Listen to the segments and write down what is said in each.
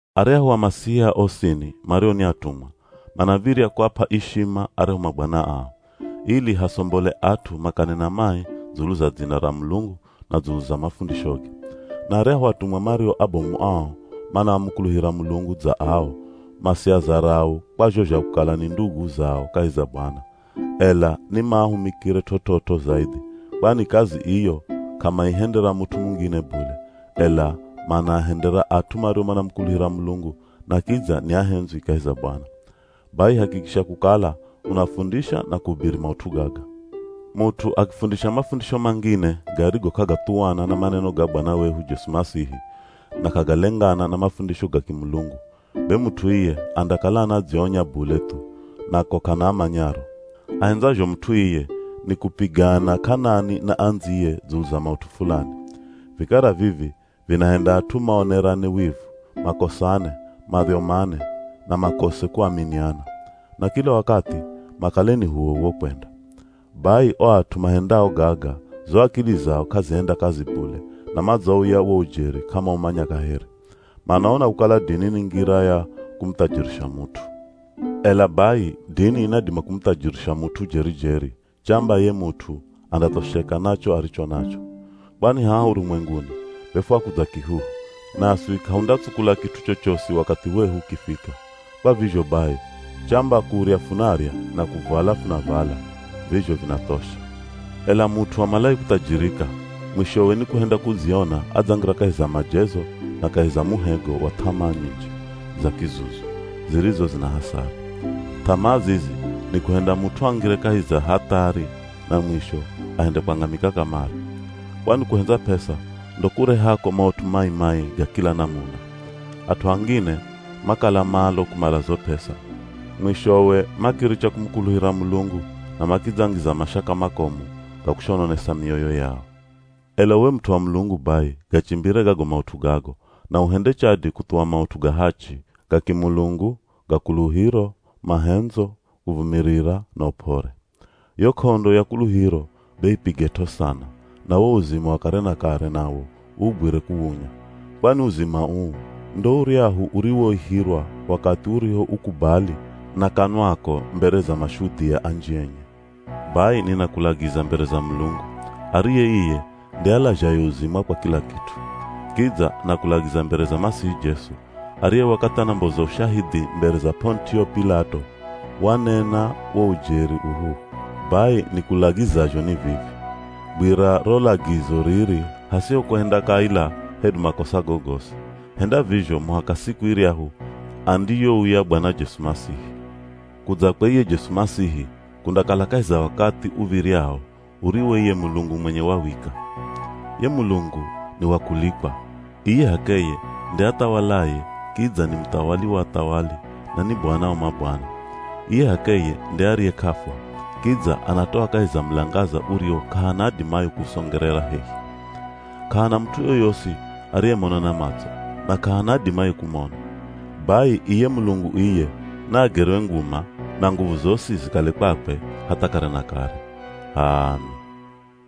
Aryahu Amasihia osini mario ni atumwa, manav̱irya kuap'a ishima aryahu mabwana ao, ili hasombole at'u makanena mai dzulu za dzina ra Mulungu na dzulu za mafundishoge. Na aryahu atumwa mario abomu ao manamukuluhira Mulungu dza ao, masiazarau kwa zho zha kukala ni ndugu zao kahi za Bwana, ela ni maahumikire t'ot'ot'o zaidhi, kwani kazi iyo k'amaihendera mut'u mungine bule, ela manaahendera at'u mario manamukuluhira Mulungu na kidza ni ahendzwi kahi za Bwana. Bai hakikisha kukala unafundisha na kuhubiri maut'u gaga. Mut'u akifundisha mafundisho mangine garigo k'agathuwana na maneno ga Bwana wehu Jesu Masihi na k'agalengana na mafundisho ga kimulungu, be mut'u iye andakala anadzionya bule thu, na ko k'ana amanyaro. Ahendzazho mut'u iye ni kupigana k'anani na andziye dzulu za maut'u fulani. Vikara vivi vinahenda at'u maonerane wivu, makosane, madhyomane, na makose kuaminiana. Na kila wakathi, makale ni h'uwoh'uwo kwenda. Bai o at'u mahendao gaga zo akili zao k'azihenda kazi bule na madzauya wo ujeri k'amaumanya kaheri. Manaona kukala dini ni ngira ya kumuthajirisha mut'u. Ela bai dini inadima kumuthajirisha mut'u jeri-jeri, chamba ye mut'u andathosheka na cho aricho nacho. Kwani haha urumwenguni be fwakudza kihuhu, naswi k'ahundatsukula kit'u chochosi wakathi wehu ukifika. Kwa vizho bai, chamba kurya funarya na kuvala funavala, vizho vinathosha. Ela mut'u amalaye kuthajirika, mwishowe ni kuhenda kudziona adzangira kahi za majezo na kahi za muhego wa th'amaa nyinji za kizuzu zirizo zina hasara. Th'amaa zizi ni kuhenda mut'u angire kahi za hathari na mwisho ahende kwangamika kamare. Kwani kuhendza p'esa ndo kurehako maut'u mai-mai ga kila namuna. At'u angine makala malo kumala zo p'esa, mwishowe makiricha kumukuluhira Mulungu na makidzangiza mashaka makomu ga kushononesa mioyo yao. Ela uwe mut'u wa Mulungu bai, gachimbire gago maut'u gago, na uhende chadi kuthuwa maut'u ga hachi, ga kimulungu, ga kuluhiro, mahendzo, kuvumirira na up'ore. Yo k'ondo ya kuluhiro be ipiget'o sana na wo uzima wa kare na kare nawo uugwire kuwunya. Kwani uzima uu ndo uryahu uriwoihirwa wakathi urihoukubali na kanwako mbere za mashudhia anji enye. Bai ninakulagiza mbere za Mulungu, ariye iye nde alazhaye uzima kwa kila kit'u. Kidza nakulagiza mbere za Masihi Jesu ariye wakathi anamboza ushahidhi mbere za P'onitio P'ilato, wanena wo ujeri uhuhu. Bai nikulagizazho ni vivi: Gwira ro lagizo riri hasiho kuhenda kaila hedu makosa gogosi, henda vizho muhaka siku iryahu andiyouya Bwana Jesu Masihi. Kudzakwe iye Jesu Masihi kundakala kahi za wakathi uv̱iryao uriwo iye Mulungu mwenye wawika. Ye Mulungu ni wa kulikwa, iye h'akeye nde athawalaye kidza ni muthawali wa athawali na ni Bwana wa mabwana. Iye h'akeye nde ariye k'afwa, kidza anatoa kahi za mulangaza uriwo k'ahana adimaye kuusongerera hehi. K'ahana mut'u yoyosi ariyemona na matso, na k'ahana adimaye kumona. Bai iye Mulungu iye naagerwe nguma na nguvu zosi zikale kwakwe hatha kare na kare. H'aami!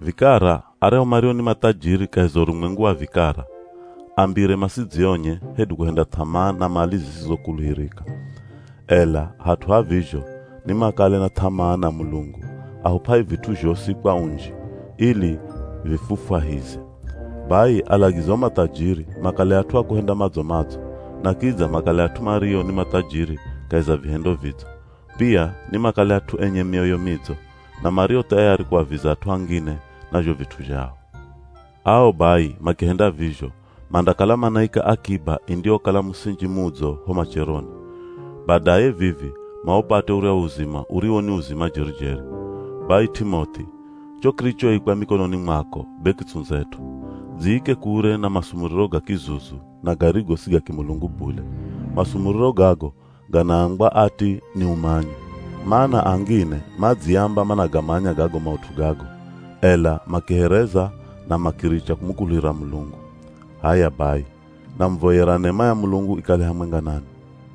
Vikara aryahu mario ni mathajiri kahi za urumwengu wa vikara, ambire masidzionye hedu kuhenda th'amaa na mali zisizokuluhirika, ela hat'u ha vizho nimakale na th'amaa na Mulungu, ahup'aye vit'u zhosi kwa unji, ili vifufwahize. Bai alagize o mathajiri makale at'u a kuhenda madzo-madzo, na kidza makale at'u mario ni mathajiri kahi za vihendo vidzo. Pia nimakale at'u enye mioyo midzo, na mario thayari kuaviza at'u angine na zho vit'u zhao. Ao, bai makihenda vizho, mandakala manaika akiba indiyokala musinji mudzo ho macheroni. Badaye vivi, maupate uryahu uzima uriwo ni uzima jeri-jeri. Bai, T'imoth'i, cho kirichoikwa mikononi mwako be kitsundzet'o. Dziike kure na masumuriro ga kizuzu na garigo si ga kimulungu bule. Masumuriro gago ganaambwa ati ni “Umanyi.” Mana angine madziamba managamanya gago maut'u gago, ela makihereza na makiricha kumukuluhira Mulungu. H'aya bai, namuvoyera nema ya Mulungu ikale hamwenga nanwi.